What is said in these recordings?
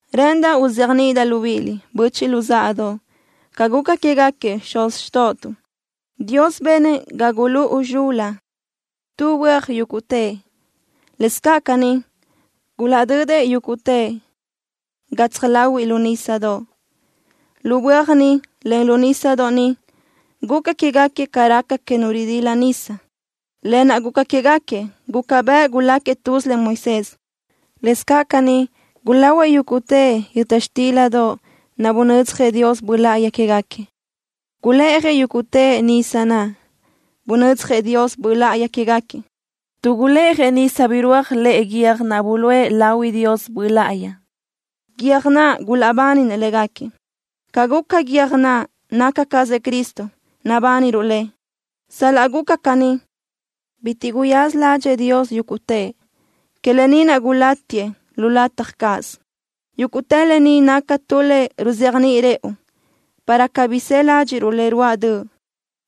Rë́ʼëndaʼ uzéajniʼidaʼ libíʼiliʼ, böchiʼ luzáʼadoʼ, ca guca quégaquiëʼ xuz xtóʼotuʼ. Dios benëʼ ga gulúʼu zxul-la tu böaj yúguʼtëʼ. Lëscaʼ caní, gulaʼdödëʼ yúguʼtëʼ gatsaj láhuiʼlö nísadoʼ. Lu böaj niʼ, en lu nísadoʼ niʼ, guca quégaquiëʼ ca raca que nu ridila nisa. Lë naʼ guca quégaquiëʼ guca bëʼ guláquiëʼ tuz len Moisés. Lëscaʼ caní, gulahuëʼ yúguʼtëʼ yöta xtildoʼ naʼ bunödzjëʼ Dios Böʼ Láʼayi quégaquiëʼ. Gulë́ʼajëʼ yúguʼtëʼ nisa naʼ bunödzjëʼ Dios Böʼ Láʼayi quégaquiëʼ, tuʼ gulë́ʼajëʼ nisa birúaj lëʼe guiö́j naʼ buluʼe lahui Dios Böʼ Láʼayi, guiö́j naʼ gulaʼbáninëʼ légaquiëʼ. Ca guca guiö́j naʼ naca cazëʼ Cristo, nabániruʼ Lëʼ. Sal-laʼ guca caní, bitiʼ guyaza ládxëʼë Dios yúguʼtëʼ. Que lë ni naʼ gulátiëʼ lu lataj cáʼasö. Yúguʼtë lë ni naca tu le ruzéajniʼi rëʼu, para cabí së ládxiʼruʼ le ruáʼ döʼ,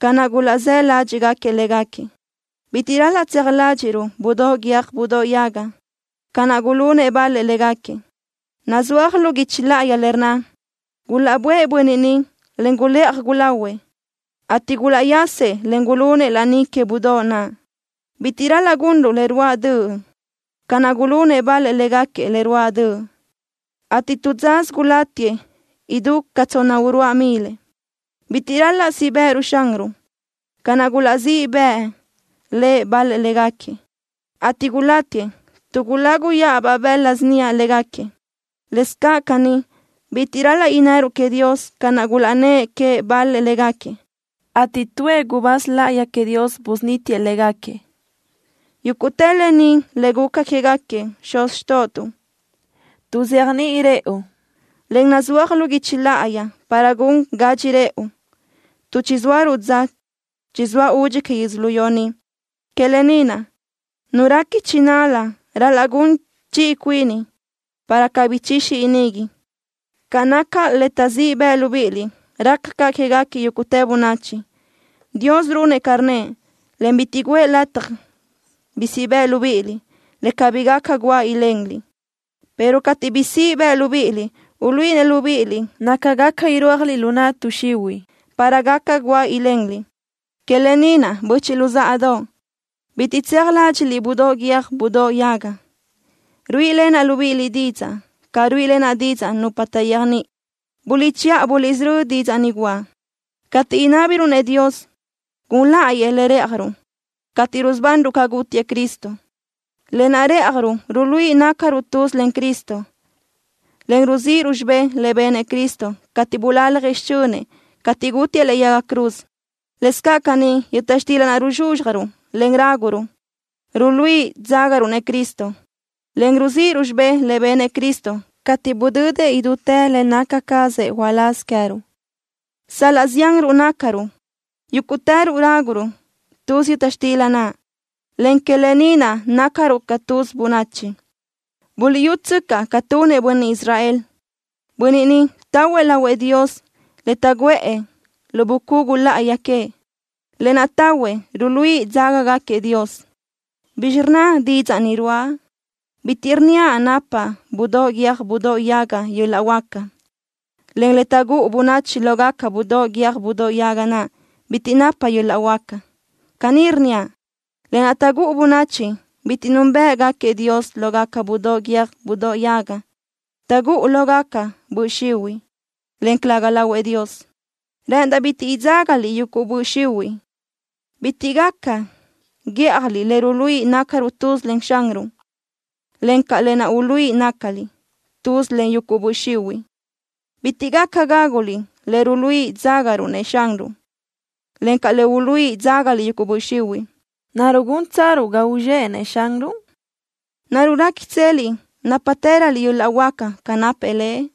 ca naʼ gulaʼzë́ ládxiʼgaquiëʼ légaquiëʼ. Bitiʼ ral-laʼ tseaj ládxiʼruʼ budóʼ guiö́j budóʼ yaga, ca naʼ gulunëʼ bal-lëʼ légaquiëʼ. Nazúaj lu guichi láʼayi le rnna: “Gulaʼböʼë bönniʼ niʼ, en gulëʼaj gulahuëʼ, ateʼ gulaʼyasëʼ, en gulunëʼ laní que budóʼ naʼ.” Bitiʼ ral-laʼ gunruʼ le ruáʼ döʼ, ca naʼ gulunëʼ bal-lëʼ légaquiëʼ le ruáʼ döʼ, ateʼ tu dzasö gulátiëʼ idú ca tsonna-uruáʼ milëʼ. Bitiʼ ral-laʼ siʼ bë́ʼëruʼ Xanruʼ, ca naʼ gulaʼzíʼ bëʼë Lëʼ bal-lëʼ légaquiëʼ, ateʼ gulátiëʼ tuʼ guláguyaʼabaʼ bëla síniaʼ légaquiëʼ. Lëscaʼ caní, bitiʼ ral-laʼ innëruʼ queëʼ Dios ca naʼ gulaʼnnë́ʼ queëʼ bal-lëʼ légaquiëʼ, ateʼ tuëʼ gubáz láʼayi queëʼ Dios busunítiëʼ légaquiëʼ. Yúguʼtë lë ni le gulaca quégaquiëʼ xuz xtóʼotuʼ, tuʼzéajniʼi rëʼu, en nazúaj lu guichi láʼayi para gun gadxi rëʼu, tuʼ chizóaruʼ dza chizóa údxi que yödzölió ni. Que lë ni naʼ, nu réqui chinal-la, ral-laʼ gun chiʼi cuini, para cabí ichixi inigui. Ca naca le taʼzíʼ bëʼ libíʼiliʼ raca caʼ quéguequi yúguʼtë bönachi. Dios runëʼ ca rnnëʼ, en bitiʼ guʼë lataj bi siʼ bëʼ libíʼiliʼ le cabí gaca guáʼ ilenliʼ, pero cateʼ bi siʼ bëʼ libíʼiliʼ, uluíʼinëʼ libíʼiliʼ naca gaca irúajliʼ lu naʼ tuʼ xihuiʼ, para gaca guáʼ ilenliʼ. Que lë ni naʼ, böchiʼ luzáʼadoʼ, bitiʼ tseaj ládxiʼliʼ budóʼ guiö́j budóʼ yaga. Ruíʼilenaʼ libíʼiliʼ didzaʼ ca ruíʼilenaʼ didzaʼ nupa taʼyéajniʼi. Buliʼchiʼa buliʼsörö́ didzaʼ ni guʼa. Cateʼ inábiruʼ-nëʼ Dios gun láʼayëʼ le rë́ʼajruʼ cateʼ rusubanruʼ ca gútiëʼ Cristo, lë naʼ rë́ʼajruʼ ruluíʼi nácaruʼ tuz len Cristo, en ruzíʼiruʼ xibé le benëʼ Cristo cateʼ bulaljëʼ xichönëʼ cateʼ gútiëʼ lëʼe yaga cruz. Lëscaʼ caní, yöta xtila naʼ ruzxúzxjaruʼ, en ráguruʼ, ruluíʼi dzágaruʼ-nëʼ Cristo, en ruzíʼiruʼ xibé le benëʼ Cristo cateʼ budödëʼ idútë le naca cazëʼ uláz queë́ruʼ. Sal-laʼ zianruʼ nácaruʼ, yúguʼtëruʼ ráguruʼ tuz yöta xtila naʼ, en que lë ni naʼ nácaruʼ ca tuz bönachi. Buliʼyútsöcaʼ ca tunëʼ bönniʼ Israel. Bönniʼ niʼ tahuëʼ lahuëʼ Dios le taʼguʼë lu bucugu láʼayi queëʼ, lë naʼ tahuëʼ ruluíʼi dzágagaquiëʼ Dios. ¿Bizxi rnna didzaʼ ni ruáʼa? Bitiʼ rnníaʼ napa budóʼ guiö́j budóʼ yaga yöl-laʼ huáca, en le taʼgúʼu bönachi lógaca budóʼ guiö́j budóʼ yaga naʼ bitiʼ napa yöl-laʼ huáca. Caní rnníaʼ: Lë naʼ taʼgúʼu bönachi bitiʼ núnbëʼgaquiëʼ Dios lógaca budóʼ guiö́j budóʼ yaga, taʼgúʼu lógaca böʼ xihuiʼ, en calëga lahuëʼ Dios. Rë́ʼëndaʼ bitiʼ idzágaliʼ yuguʼ böʼ xihuiʼ. Bitiʼ gaca guíʼjaliʼ le ruluíʼi nácaruʼ tuz len Xanruʼ, encaʼ lë naʼ uluíʼi nácaliʼ tuz len yuguʼ böʼ xihuiʼ. Bitiʼ gaca gáguliʼ le ruluíʼi dzágaruʼ-nëʼ Xanruʼ, encaʼ le uluíʼi dzágaliʼ yuguʼ böʼ xihuiʼ. ¿Naruʼ gúntsaruʼ ga uzxéʼenëʼ Xanruʼ? ¿Naruʼ réquitseliʼ nápatëröliʼ yöl-laʼ huáca ca napëʼ Lëʼ?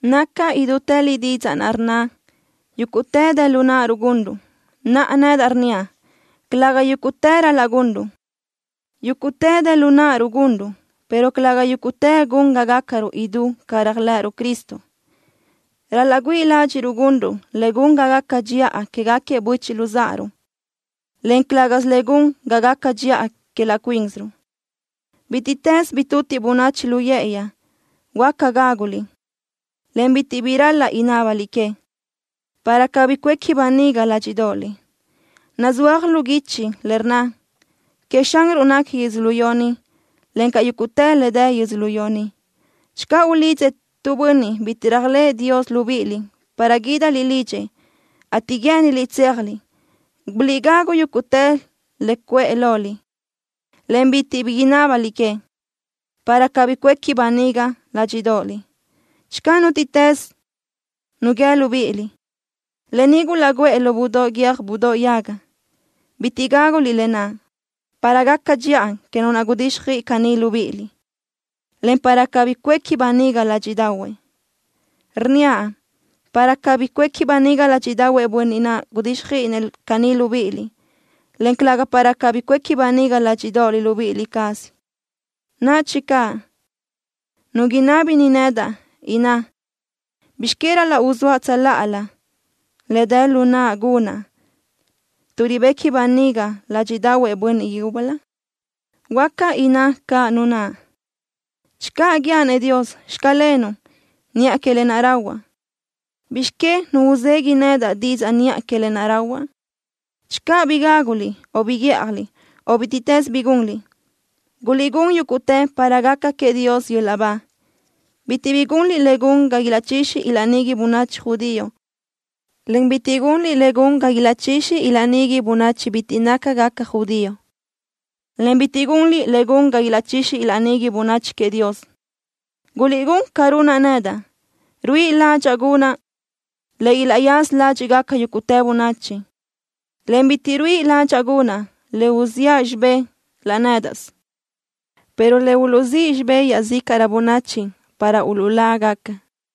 Naca idútë li didzaʼ naʼ rnna: “Yúguʼtë dë lu náʼaruʼ gunruʼ.” Naʼa, nedaʼ rnníaʼ: Calëga yúguʼtë ral-laʼ gunruʼ. Yúguʼtë dë lu náʼaruʼ gunruʼ, pero calëga yúguʼtë gun ga gácarö idú ca réajlëʼëruʼ Cristo. Ral-laʼ güíʼi ládxiʼruʼ gunruʼ le gun ga gaca dxiʼa quégaquiëʼ böchiʼ luzáʼaruʼ, en calë́gasö le gun ga gaca dxiʼa que laʼ cuínsiruʼ. Bítiʼtës bi tutiʼ bönachi lu yë́ʼëyi, huáca gáguliʼ, en bitiʼ bi ral-laʼ inábaliʼ que, para cabí cuéqui böniga ládxiʼdoʼoliʼ. Nazúaj lu guichi le rnna: “Queëʼ Xanruʼ nequi yödzölió ni, encaʼ yúguʼtë le dë yödzölió ni.” Channö ulidzëʼ tu bönniʼ bitiʼ réajlëʼë Dios libíʼiliʼ para guídaliʼ lidxëʼ, ateʼ guë́ʼëniliʼ tséajliʼ, guliʼgagu yúguʼtë le cuʼë loliʼ, en bitiʼ bi inábaliʼ que, para cabí cuéqui böniga ládxiʼdoʼoliʼ. Channö nútiʼtës nu guíë libíʼiliʼ: “Lë ni gulaʼguʼë lo budóʼ guiö́j budóʼ yaga”, bitiʼ gáguliʼ lë naʼ para gaca dxiʼa que nu naʼ gudíxjöiʼi caní libíʼiliʼ, en para cabí cuéqui böniga ládxiʼdaʼahuëʼ. Rnníaʼ: Para cabí cuéqui böniga ládxiʼdaʼahuëʼ bönniʼ naʼ gudíxjöiʼinëʼ caní libíʼiliʼ, en calëga para cabí cuéqui böniga ládxiʼdoʼoliʼ libíʼi cázaliʼ. Nadxi caʼ nu inábini nedaʼ, inná: “¿Bizx que ral-laʼ uzóaʼ tsöláʼalö le dë lu naʼa gunaʼ tuʼ ribequi böniga ládxiʼdaʼahuëʼ bönniʼ yúbölö?” Huáca inná caʼ nu naʼ: “Channö guíaʼ-nëʼ Dios: Xclenuʼ, niʼa que lë naʼ rahuaʼ, ¿bizx que nu uzegui nedaʼ didzaʼ niʼa que lë naʼ rahuaʼ?” Channö bi gáguliʼ o bi guíʼjaliʼ, o bítiʼtës bi gunliʼ, guliʼgún yúguʼtë para gaca queëʼ Dios yöl-laʼ ba. Bitiʼ bi gunliʼ le gun ga ilaʼchixi ilaʼnigui bönachi judío, en bitiʼ gunliʼ le gun ga ilaʼchixi ilaʼnigui bönachi bitiʼ nácagaca judío, en bitiʼ gunliʼ le gun ga ilaʼchixi ilaʼnigui bönachi queëʼ Dios. Guliʼgún ca runaʼ nedaʼ. Ruíʼi ládxaʼa gunaʼ le ilaʼyaza ládxiʼgaca yúguʼtë bönachi, en bitiʼ ruíʼi ládxaʼa gunaʼ le uziʼa xibé laʼ nédaʼsö, pero le uluʼzíʼ xibé iaʼzícaʼrö bönachi para uluʼlágaca.